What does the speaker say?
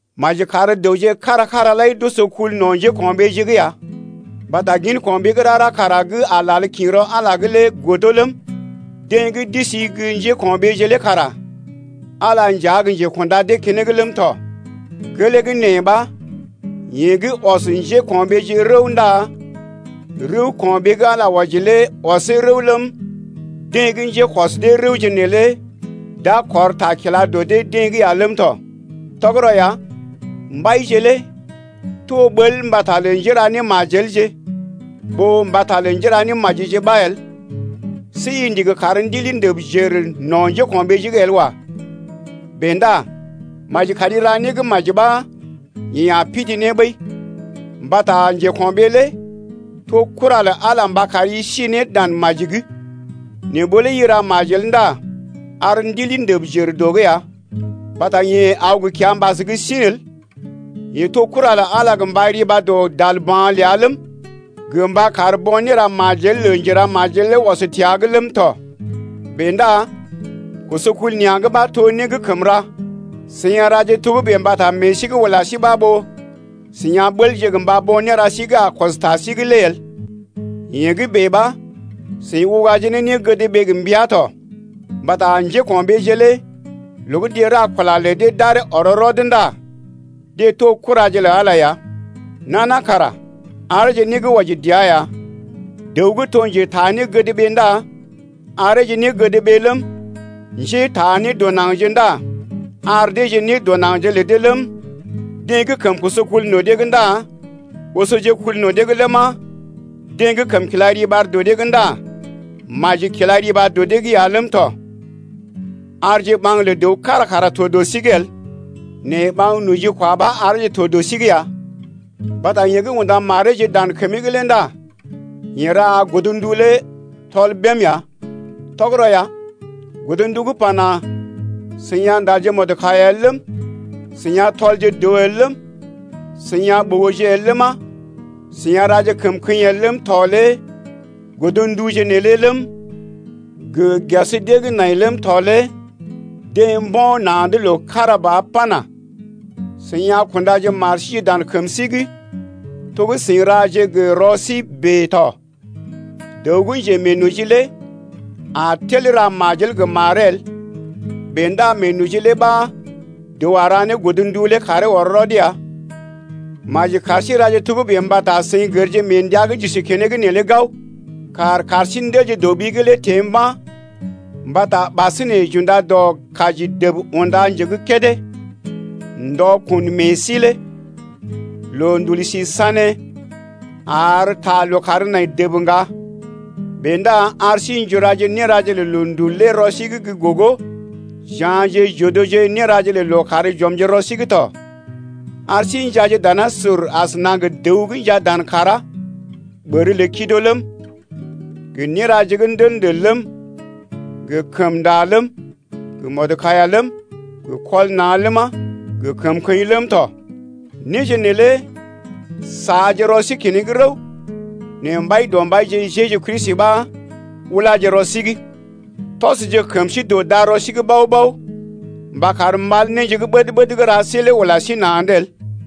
Maji kar dəwje kára-kára lai d’oso kul no̰ njéko̰ɓeeje’g ya, mbata gin ko̰ɓee gə́ rara kara gə́ a lal kḭ rɔ Ala’g lé godo ləm, deḛ gə́ d’isi gə́ njéko̰ɓeeje lé kara Ala nja gə́ njekunda dee keneŋ ləm tɔ. Gelee gə́ nee ɓa yeḛ gə́ ɔs njéko̰ɓeeje rəw ndá rəw ko̰ɓee gə́ Ala wɔji lé ɔsee rəw ləm, deḛ gə́ njékɔs dee rəwje neelé d’a kɔr ta kila dɔ dee-deḛ’g ya ləm tɔ. Tɔgərɔ ya, mbaije lé to ɓəl mbata lə njéra némajelje ɓó mbata lə njéra némajije ɓa el. See i ndigi kar ndili ndəb jər no̰ njéko̰ɓeeje’g el wa. Bèe ndá maji kari ra né gə́ maji ɓa yeḛ a pidii ne ɓəi. Mbata njeko̰ɓee lé to kura lə Ala mba kari si ne dan maji’g. Nɛ ɓó lé i ra majel ndá ar ndili ndəb jər dɔ’g ya, mbata yeḛ aw gə kiambas gə́ sḭ el, yeḛ to kura lə Ala gə mba riba dɔ dalba̰ ləa ləm, gə mba kar bo̰ néra majel lə njeramajel lé ɔs təa’g ləm tɔ. Bèe ndá koso kul nea̰’g ɓa to né gə́ kəm ra, seḭ a raje togə́bè mbata meḛ sí gə́ ula sí ɓa ɓó seḭ a ɓəlje gə mba bo̰ néra sí gə́ a kɔs ta sí’g lé el. Yee gə́ bèe ɓa seḭ ugaje ne négədɓee gə mbəa tɔ. Mbata njéko̰ɓeeje lé loo gə́ deḛ ra kula lə dee d’aree ɔr rɔd ndá deḛ to kuraje lə Ala ya. Nana kara areeje né gə́ wɔji dəa ya: dəw gə́ to njetaa négədɓee ndá areeje négədɓee ləm, Njétaa nédɔnaŋgje ndá ar deeje nédɔnaŋgje lə dee ləm, deḛ gə́ kəm koso kul no̰ dee’g ndá osoje kul no̰ dee’g ləma, deḛ gə́ kəm kila riɓar dɔ dee’g ndá maji kila riɓar dɔ dee’g ya ləm tɔ. Arje ɓaŋg lə dəw kára kara to dɔ sí’g el nɛ ɓaŋg nojikwa ɓa areeje to dɔ sí’g ya, mbata yeḛ gə́ unda mareeje dan kəmee’g lé ndá yeḛ ra godndu lé tɔl bém ya. Tɔgərɔ ya, godndu gə́ pana: I a ndal mɔdkaiya el ləm, i a tɔl dəw el ləm, i a ɓogo el ləma, i a raje kəmkəḭ el ləm tɔ lé godnduje neelé ləm, gə ges dee gə́ nai ləm tɔ lé deḛ mbo̰ na̰’d loo kára ba pana: I a kunda mari dan kəmi’g to gə́ i ra ne gə rɔi bèe tɔ. Dəw gə́ njemeenoji lé a tel ra majel gə maree el, bèe ndá meenoji lé ɓa dəw a ra ne godndu lé karee ɔr rɔd ya. Maji kar sí raje togə́bè mbata seḭ gərje mee ndəa gə́ j’isi keneŋ neelé gao: kàr kar sí ndelje dɔ ɓi’g lé teḛ mba̰ mbata ɓasinè j’unda dɔ kaji dəb unda nje gə́ kédé ndɔ kun meḛ sí lé. Loondul si sané ar ta lookàr nai dəb ŋga. Bèe ndá ar sí n’juraje néraje lə loondul lé rɔ sí’g gə́ gogo, j’ya̰je j’odoje néraje lə lookàr j’ɔmje rɔ sí’g tɔ. Ar sí njaaje danasur asəna gə dəw gə́ njaa dan kàrá. Ɓər lə kido ləm, gə néraje gə́ ndəl-ndəl ləm, gə kəmnda ləm, gə mɔdkaiya ləm, gə kɔl na̰ ləma, gə kəmkəḭ ləm tɔ, néje neelé saaje rɔ sí keneŋ rəw. Nɛ Mbaidɔmbaije Jeju Kristi ɓa ulaje rɔ sí’g. Tɔsje kəm sí dɔ darɔ sí’g bao-bao mba kar mal néje gə́ ɓəd-ɓəd gə́ ra sí lé ula sí na̰’d el.